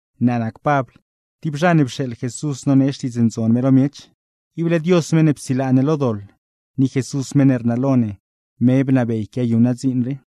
Naa nac Pabl, tib zha ne pxeeḻ Jesús nonee Xtiidz Ndzon me lo miech. Ible Dios meṉ ne psilaa ne lo doḻ, ni Jesús meṉ ne rnalo ne, me bnabey quiayuṉ naa dziin rii.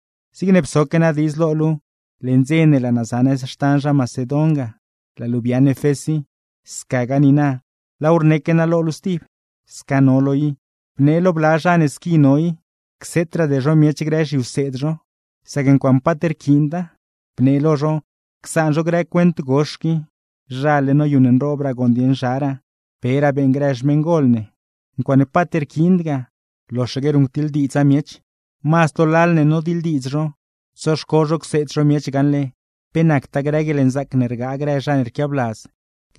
Zigne psoque naa diidz lo luu leṉ dze ne laa naa za nëz xtan zha Macedon ga, laa luu biaaṉ Efés i; scagaa niina laaw rneque naa lo luu stib: Sca no luu i, bnee lo bla zha ne squi no i, cseetraade zho miech grë zhiwseed zho, sac ncuaaṉe paat rquiinda. Bnee lo zho, csaan zho grë cuent gox qui, zhale noyuṉnroobraa gooṉ dieṉ zharaa, peraa beeṉ grë xmeṉgol ne. Ncuaaṉe paat rquiind ga, loxaque ruṉctiḻdiidza miech; mazd lo lal ne nodiḻdiidz zho, tsoxco zho cseed zho miech gaṉle pe nactaa grë guieḻnzaac ne rgaa grë zha ne rquiabladz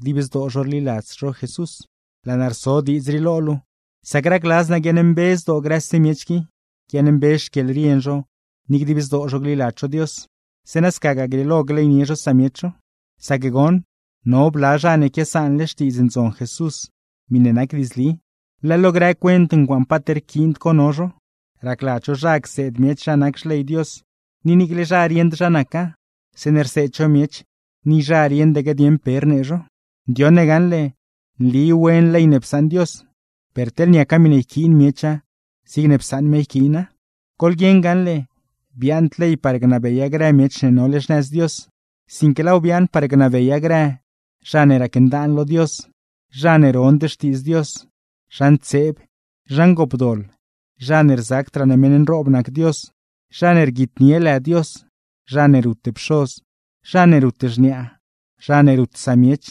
dib zdoo rliladz Jesús. Laa naa rso diidz rii lo luu, sac racladz naa guiaaṉmbe zdoo grëse miech qui, guiaaṉmbe xquieḻrien zho ni dib zdoo zho gliladz zho Dios; zeeṉa scagaa grieelo gleynie zho samiech zho. Sac goṉ, no bla zha ne quiasaanle Xtiidz Ndzon Jesús miṉe nac diidzli, leḻ lo grë cuent ncuaaṉe paat rquiind co no zho. Racladz zho zha cseed miech zha nac xley Dios, ni niicle zha rieṉd zha naca; zeeṉe rseed zho miech ni zha rieṉdaque dieṉ pe rnee zho. Ndioṉle ne gaṉle nli wen ley ne psaṉ Dios, per teḻ niaca miṉe yquiin miecha zigne psaṉ me yquiina. Goḻguieṉ gaṉle, biaaṉd ley par gnabeya grë miech ne nole xnëz Dios, sinque laaw biaaṉ par gnabeya grë: zha ne racndaan lo Dios, zha ne rond xtiidz Dios, zha ntseeb, zha ngoopdoḻ, zha ne rzacdraa ne meṉ nroob nac Dios, zha ne rguitnie lë Dios, zha ne rut pxoz, zha ne rut xniaa, zha ne rut samiech,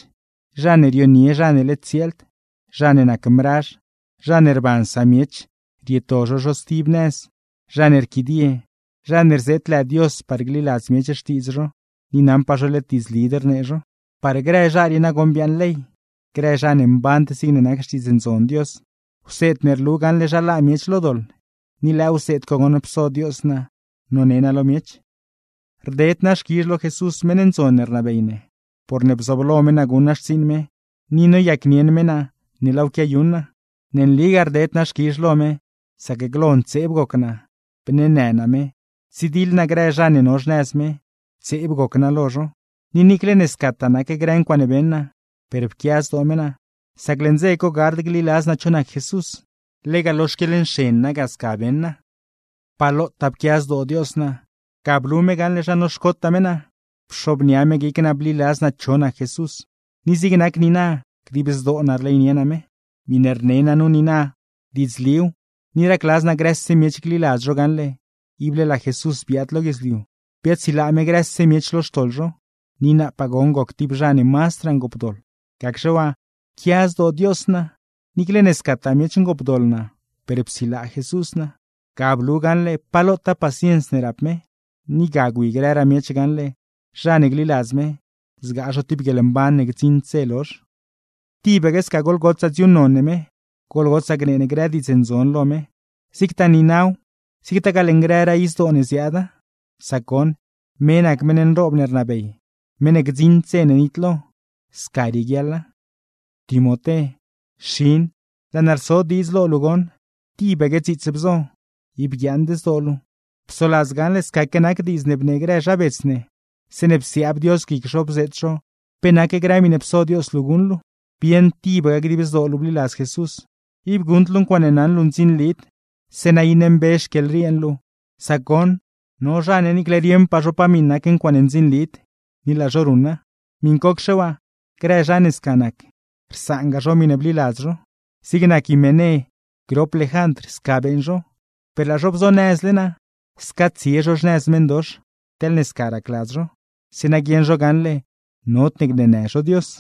zha ne rionie zha ne led tsieeld, zha ne nac mrazh, zha ne rban samiech rieto zho zho stib nëz, zha ne rquidie, zha ne rzeet lë Dios par gliladz miech xtiidz zho, ni naṉpaa zho led diidzlid rnee zho. Par grë zha rii nagoṉ biaaṉ ley; grë zha ne mband zigne nac Xtiidz Ndzon Dios; wseed ne rlu gaṉle zha laa miech lo doḻ. Ni lëë wseed co goṉ pso Dios naa none naa lo miech. Rded naa xquizh lo Jesús meṉ ndzon ne rnabey ne, porne bzooblo me naa guṉ naa xtsiiṉ me, ni noyacnieṉ me naa ne laaw quiayuṉ naa. Ne nligaa rded naa xquizh lo me, sac glo ntseeb goc naa, bneenë naa me, ptsidiḻ naa grë zha ne no xnëz me, ntseeb goc naa lo zho. Ni niicle ne scataa nac grë ncuaaṉe beṉ naa, per pquia zdoo me naa; sac leṉ dze co gard gliladz naa cho nac Jesús, lega lo xquieḻnxen naa ga sca beṉ naa. ¡Pa lotaa pquia zdoo Dios naa! Ga blu me gaṉle zha noxcotaa me naa, pxobnia me guic naa bliladz naa cho nac Jesús, ni zig nac niina dib zdoo naa rleynie naa me. Miṉe rne naa nu niina, diidzliw, ni racladz naa grëse miech gliladz zho gaṉle, ible laa Jesús biaad lo guidzliu, biaadsilaa me grëse miech lo xtoḻ zho; ni naapaa goṉ goc tib zha ne mazdraa ngoopdoḻ. Gacxe waa pquia zdoo Dios naa, niicle ne scataa miech ngoopdoḻ naa per psilaa Jesús naa. Ga blu gaṉle pa lotaa paciens ne rap me; ni ga gwi grëraa miech gaṉle, zha ne gliladz me, zgaa zho tib guieḻmban ne gdziṉd dze lozh. ¡Tibaque sca goḻgotsaa dziuuṉnon ne me, goḻgotsaa gnee ne grë diidz ndzon lo me, zigtaa niinaw zigtagaa leṉ grëraa izdoo ne ziaada! Sac goṉ, me nac meṉ nroob ne rnabey, meṉ ne gdziṉd dze ne nitlo. Sca rieguiaḻa. Timoté, xin, laa naa rso diidz lo luu goṉ: Tibaque dziits bzo, ib guiaaṉd zdoo luu; psoladz gaṉle scaque nac diidz ne bnee grë zha bets ne zeeṉe psiaab Dios guic zho bzeet zho pe nac grë miṉe pso Dios luu guṉ luu. Bieṉ tibaque dib zdoo luu bliladz Jesús, ib guṉd luu ncuaaṉe naṉ luu ndzinlid, zeeṉa iṉe mbe xquieḻrien luu; sac goṉ no zha ne niicle rieṉpaa zho pa miṉ nac ncuaaṉe ndzinlid, ni laa zho ruṉa. ¡Miṉcocxe waa, grë zha ne sca nac, rsaanga zho miṉe bliladz zho! Zig nac Himené grop Lejandr, sca beeṉ zho; per laa zho bzonëzle naa sca tsie zho xnëz meṉdox teḻne sca racladz zho; zeeṉa guieṉ zho gaṉle nodne gneenë zho Dios.